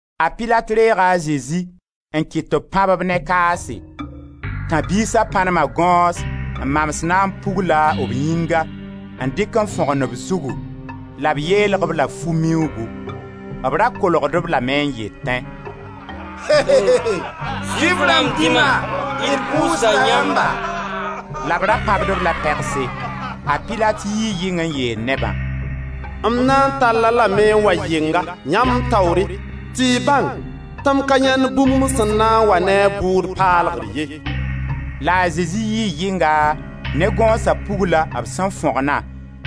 A Pilat reega a Zezi n kɩt tɩ b pãb-b ne kaase. Tãb-biisa pãnema gõos n maan naam pugla b yĩnga, n dɩk n fõgen b zugu la b yeelg-b la fu miuugu. B ra kolgd-b lame n yetẽ: «Zʋɩf rãmb dĩma, d pʋʋsda yãmba!» La b ra pãbd-b la pegse. A Pilat yii yɩng n yeel nebã: «M na n tall-a lame n wa yɩnga, yãmb taoore, tɩ y bãng tɩ m ka yãend bũmb sẽn na n wa ne a bʋʋd paalgr ye.» La a Zezi yii yɩnga ne gõosa pugla b sẽn fõgna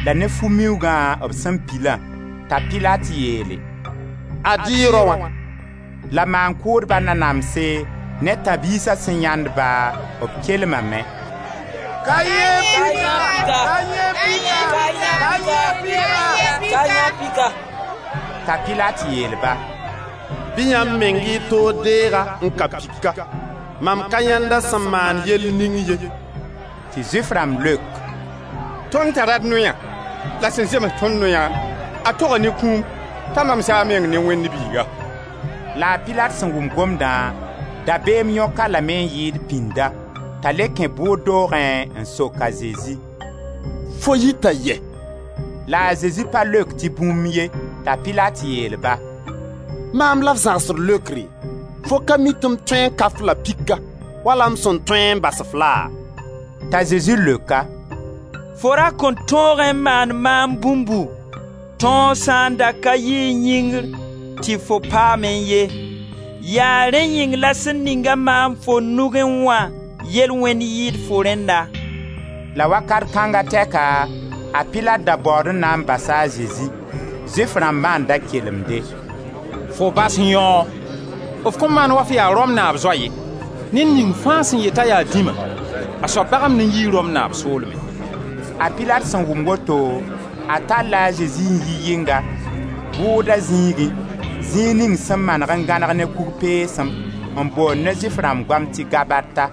la ne fu miuugã b sẽn pilã, t'a Pilat yeele: «Ad-y y raoã!» La maan-kʋʋdba nanamse ne tãb-biisa sẽn yãend-ba, b kelmame: «Ka-y yẽe pika, ka-y yẽe pika!» T'a Pilat yeel-ba: «Bɩ yãmb meng y toor deeg-a n ka pika, mam ka yãend a sẽn maan yell ning ye.» Tɩ Zʋɩf rãmb leok: «Tõnd tara d noya, la sẽn zems ne tõnd noya, a toga ne kũum t'a mamsa a meng ne Wẽnd Biiga.» La a Pilat sẽn wʋm gomdã, dabeem yõk-a lame n yɩɩd pĩnda, t'a le kẽ bʋʋd doogẽ n sok a Zezi: «Fo yita yɛ?» La a Zezi pa leok tɩ bũmb ye. T'a Pilat yeel-ba: «Maam la f zãgsd leokre? Fo ka mi tɩ m tõe n ka-f la pika, wala m sẽn tõe n bas-f laa?» T'a Zezi leok-a: «Fo ra kõn tõogẽ n maan maam bũmbu, tõog sã n da ka yiẽ yĩngr tɩ fo paamẽ ye, yaa rẽnd yĩng la sẽn ning-a maam fo nugẽ wã yel-wẽnd yɩɩd fo rẽnna.» La wakat kãnga tɛka, a Pilat da baood n na n basa a Zezi. Zʋɩf rãmbã n da kelemde: «Fo bas yãoo, f kõn maan wa f yaa Rom naab zoa ye. Ned ning fãa sẽn yet t'a yaa dĩma, a soab bagemd n yii Rom naab soolmẽ.» A Pilat sẽn wʋm woto, a talla a Zezi n yɩ yɩnga, bʋʋda zĩigẽ, zĩig ning sẽn maneg n gãneg ne kug peesem, n boond ne Zʋɩf rãmb goam tɩ gabata.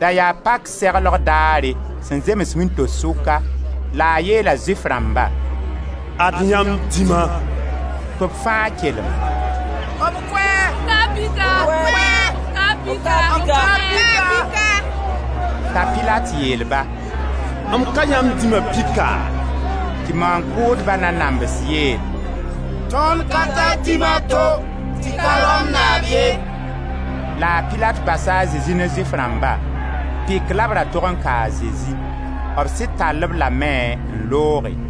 Da yaa pak seglgo daare, sẽn zems wĩnto-sʋka, la a yeela Zʋɩf rãmba: «Ad yãmb dĩma!» Tɩ b fãa kelem: «B kʋ-a, b kʋ-a, b ka-a pika!» T'a Pilat yeel-ba: «M ka yãmb dĩma pika?» Tɩ maan-kʋʋdba nanams yeel: «Tõnd ka tar dĩma to tɩ ka Rom naab ye.» La a Pilat basa a Zezi ne Zʋɩf rãmba. Pik la b ra tog n ka a Zezi. B sɩd tall-b lame n looge.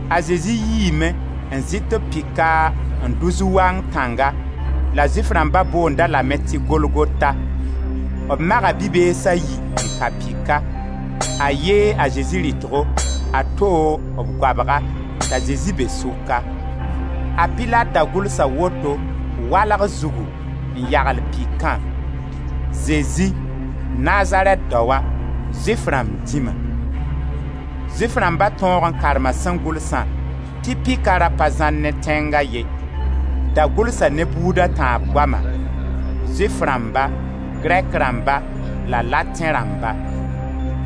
A Zezi yiime, n zɩt b pika n dʋ zu-wang tãnga, la Zʋɩf rãmba boond-a lame tɩ Golgota. B maga bi-bees a yi n ka pika, a ye a Zezi rɩtgo, a to, b goabga, t'a Zezi be sʋka. A Pilat da gʋlsa woto walg zugu n yagl pikã: «Zezi, Nazarɛt daoa, Zʋɩf rãmb dĩma.» Zʋɩf rãmba tõog n karma sẽn gʋlsã tɩ pika ra pa zãar ne tẽnga ye. Da gʋlsa ne buuda tãab goama: Zʋɩf rãmba, Grɛk rãmba la Latẽ rãmba.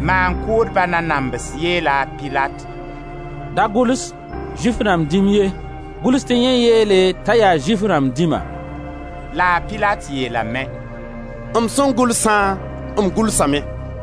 Maan-kʋʋdba nanams yeela a Pilat: «Da gʋls: ‹Zʋɩf rãmb dĩm ye,› gʋls tɩ yẽ n yeele t'a yaa Zʋɩf rãmb dĩma.» La a Pilat yeelame: «M sẽn gʋlsã, m gʋlsame.»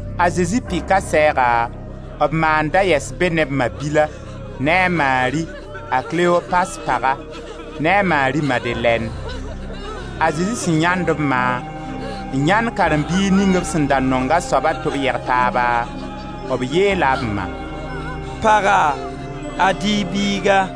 A Zezi pika sɛɛga, b ma n da yɛs be ne b ma-bila, ne a Mari, a Klopas paga, ne a Mari Madelɛn. A Zezi sẽn yãend b ma, n yãend karen-biig ning b sẽn da nong a soaba tɩ b yeg taaba, b yeela b ma: «Paga, ad-y y biiga.»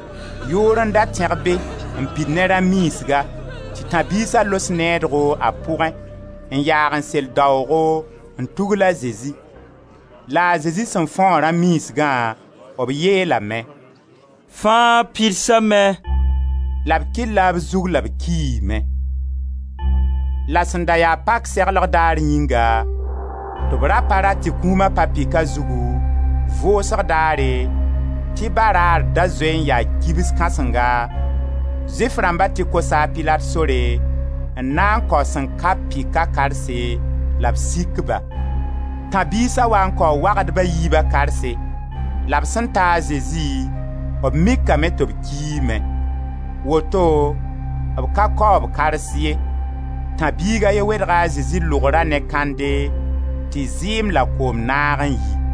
Yʋʋr n da tẽg be n pid ne rã miisga tɩ tãb-biisa los needgo a pʋgẽ, n yaag n sel daoogo, n tugla Zezi. La a Zezi sẽn fõog rã miisgã, b yeelame: «Fãa pidsame!» La b kɩlla b zug la b kiime. La sẽn da ya pak seglg daar yĩnga, tɩ b ra pa rat tɩ kũuma pa pika zugu, vʋʋsg daare, tɩ baraar da zoe n yaa kibs kãsenga, Zʋɩf rãmba tɩ kosa a Pilat sore n na kao sẽn ka-b pika karse la b sik-ba. Tãb-biisa waa n kao wagdba a yiiba karse. La b sẽn taa a Zezi b mikame tɩ b kiime. Woto b ka kao b kars ye. Tãb-biig a ye wedga a Zezi lʋgra ne kãnde tɩ zɩɩm la koom naag n yi.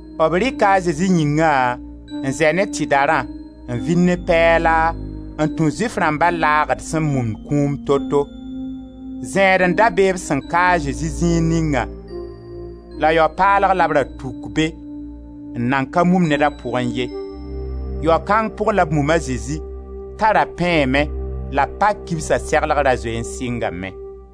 B rɩka a Zezi yĩngã n zɛ ne tɩdarã n vil ne pɛɛla n tũ Zʋɩf rãmba laagd sẽn mumd kũum to-to. Zẽed n da be b sẽn ka a Zezi zĩig ningã la yao-paalg la b ra tuk be n nan ka mum ned a pʋgẽ ye. Yao-kang pʋg la b mum a Zezi t'a ra pẽeme la pak kibsa seglg ra zoe n sɩngame.